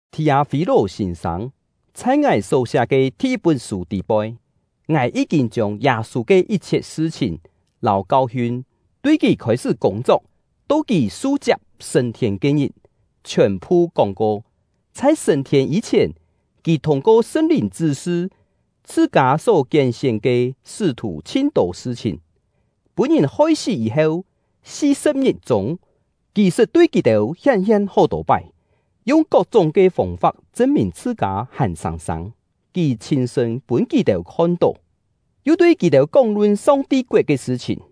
Thì-â-fî-lò Sîn-sâng: Chhai ngài só-siá ke thi-yit-pún sû tî-poi, ngài yí-kîn chiông Yâ-sû ke yit-chhiet sṳ-chhìn lâu kau-hiun, tui kì khôi-sṳ́ kûng-chok, to kì su-chiap sṳ̂n-thiên ke-ngit, chhiòn-phu kóng-ko. Chhai sṳ̂n-thiên yî-chhièn, kì thûng-ko Sṳn-Lìn chṳ́-sṳ chhṳ-kâ só kién-sién ke sṳ́-thù chhin-tô sṳ-chhìn. Pûn-ngìn hoi-sí yî-heu si-sṳ̍p-ngit-chûng, kì sṳt tui kì-têu hién-hien hó-tô pái, yung kok-chúng ke fông-fap chṳn-mìn chhṳ-kâ hàn sâng-sâng; kì chhîn-sṳ̂n pûn kì-têu khon-tó, yu tui kì-têu kóng-lun Song-ti koet ke sṳ-chhìn.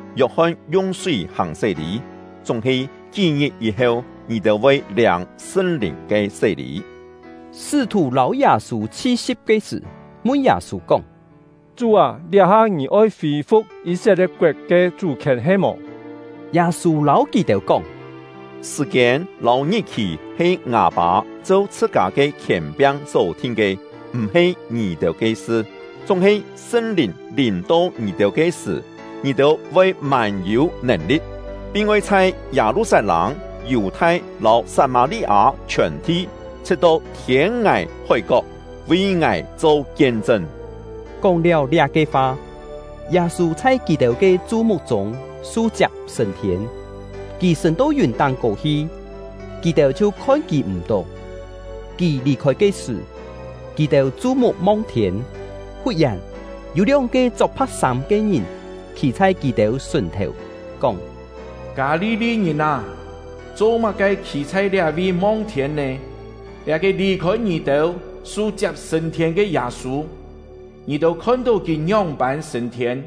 Yok-hon yung súi hàng sé-lî, chúng-he kí-ngit yî-heu ngì-têu voi liâng Sṳn-Lìn ke sé-lî.” Sṳ́-thù lâu Yâ-sû chhi-si̍p ke sṳ̀, mun Yâ-sû kóng: “Chú â, liá-ha ngì oi fî-fu̍k Yî-set-lie̍t-koet ke chú-khièn he-mò?” Yâ-sû lâu kì-têu kóng: “Sṳ̀-kiên lâu ngit-khì he ngâ Pâ cheu chhṳ-kâ ke khièn-piang só-thin ke, m̀-he ngì-têu ke sṳ. Chúng-he Sṳn-Lìn lìm-to ngì-têu ke sṳ̀, ngì-têu voi mân-yû nèn-li̍t, pin oi chhai Yâ-lu-sat-lâng, Yù-thai lâu Sat-mâ-li-â chhiòn-thi, chhṳ̍t-to thiên-ngài hói-kok, vi ngài cho kien-chṳn.” Kóng-liáu liá-ke fa, Yâ-sû chhai kì-têu ke chu-muk-chûng su-chiap sṳ̂n-thiên; kì sṳ̂n-to yùn táng-kô hi, kì-têu chhiu khon kì m̀-tó. Kì lì-khôi ke sṳ̀, kì-têu chu-muk mong thiên. Fut-yèn, yû lióng-ke chok pha̍k-sâm ke ngìn khî chhai kì-têu sùn-thèu, kóng: “Kâ-li-li-ngìn â, cho-má-ke khî chhai liá-vi mong thiên nè? Liá-ke lì-khôi ngì-têu, su-chiap sṳ̂n-thiên ke Yâ-sû, ngì-têu khon-tó kì ngióng-pân sṳ̂n-thiên,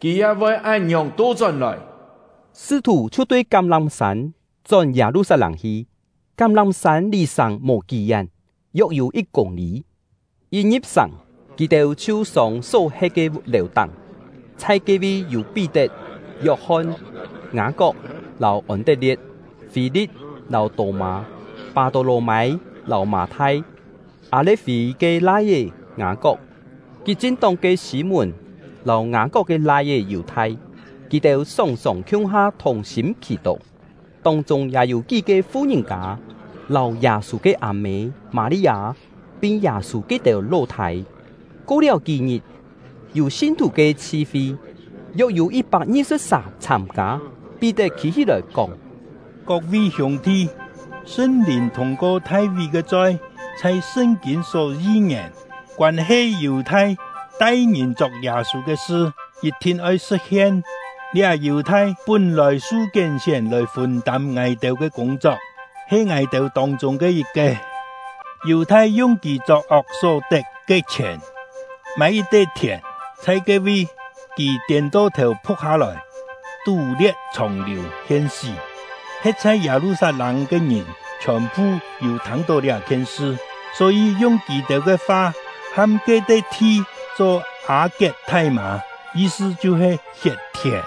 kì ya voi án-ngiòng to-chón-lòi.” Sṳ́-thù chhiu tui Kám-lám-sân chón Yâ-lu-sat-lâng hi; Kám-lám-sân lì sàng mò kí-yén, yok-yû yit kûng-lî. Yit ngi̍p sàng, kì-têu chhiu sông só he̍t ke lèu-táng; chhai ke-vi yû Pí-tet, Yok-hon, Ngâ-kok lâu Ôn-tet-lie̍t, Fî-li̍t lâu Tô-mâ, Pâ-tô-lò-mâi lâu Mâ-thai, Â-le̍t-fî ke lai-é Ngâ-kok, Kit-chin-tóng ke Sî-mùn, lâu Ngâ-kok ke lai-é Yù-thai. Kì-têu sòng-sòng khiung-ha thùng-sîm khì-tó; tông-chûng ya yû kí-ke fu-ngìn-kâ lâu Yâ-sû ke â-mê Mâ-li-â, pin Yâ-sû ke-têu ló-thâi. Ko-liáu kí-ngit, yû sin-thù ke chhi-fi, yok-yû yit-pak ngi-sṳ̍p sà chhâm-kâ. Pí-tet khî-hí-lòi, kóng: “Kok-vi hiûng-thi! Sṳn-Lìn thûng-ko Thai-ví ke choi chhai Sṳn-kîn só yi-ngièn, koân-he Yù-thai tai ngìn chok Yâ-sû ke sṳ, yit-thin oi sṳ̍t-hien. Liá Yù-thai pún-lòi su kién-sién lòi fûn-tâm ngài-têu ke kûng-chok, he ngài-têu tông-chûng ke yit-ke.” (Yù-thai yung kì chok-ok só tet ke chhièn mâi yit-te thièn; chhai ke-vi, kì tiên-to-thèu phuk hâ-lòi, tú-lie̍t chhòng-liù, hien-sí. He̍t chhai Yâ-lu-sat-lâng ke ngìn chhiòn-phu yû thâng-tó liá-khien sṳ, só-yî yung kì-têu ke fa ham ke-te thi cho Â-kiet-thai-mâ, yi-sṳ chhiu-he “Hiet-thièn”.)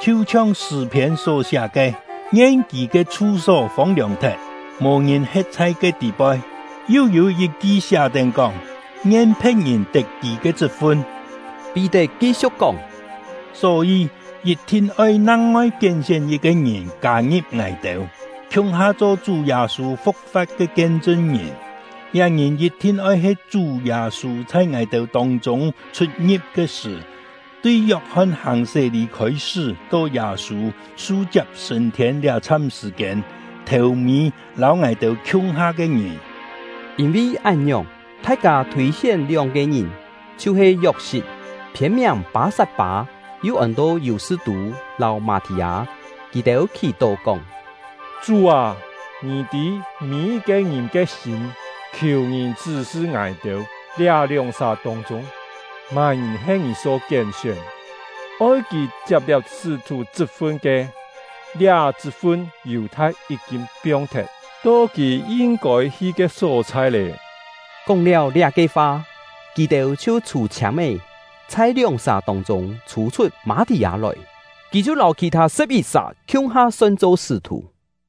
“Chhiu-chhiong Sṳ̂-phiên só-siá ke: Ngien kì ke chhu-só fông-liòng thet, mò ngìn he̍t chhai ke tî-poi. Yu yû yit-ki siá-tén kóng: Ngien phe̍t-ngìn tet kì ke chṳt-fun.” Pí-tet ki-siu̍k kóng: “Só-yî, yit-thin oi nang-ngoi kién-sién yit-ke ngìn kâ-ngi̍p ngài-têu, khiung-ha cho Chú Yâ-sû fu̍k-fa̍t ke kien-chṳn-ngìn. Liá ngìn yit-thin oi he Chú Yâ-sû chhai ngài-têu tông-chûng chhut-ngi̍p ke sṳ̀, tui Yok-hon hàng sé-lî khôi-sṳ́ to Yâ-sû su-chiap sṳ̂n-thiên liá-chham sṳ̀-kiên, thèu-mî lâu ngài-têu khiung-ha ke ngìn.” Yîn-vi án-ngiòng, thai-kâ thûi-sién lióng-ke ngìn, chhiu-he Yok-sit (phiên-miàng Pâ-sat-pâ, yu ôn-to Yù-sṳ-tû) lâu Mâ-thì-â. Kì-têu khì-tó kóng: “Chú â, Ngì tî mî-yit-ke ngìn ke sîm; khiù Ngì chṳ́-sṳ ngài-têu, liá lióng-sà tông-chûng má-ngìn he Ngì só kién-sién, oi kì chiap liá sṳ́-thù chṳt-fun ke. Liá chṳt-fun Yù-thai yí-kîn piong-thet, to kì yin-kôi hi ke só-chhai lé.” Kóng-liáu liá-ke fa, kì-têu chhiu chhû-chhiâm-é, chhai lióng-sà tông-chûng chhû-chhut Mâ-thì-â lòi; kì chhiu lâu khì-thâ sṳ̍p-yit-sà khiung-ha son-cho sṳ́-thù.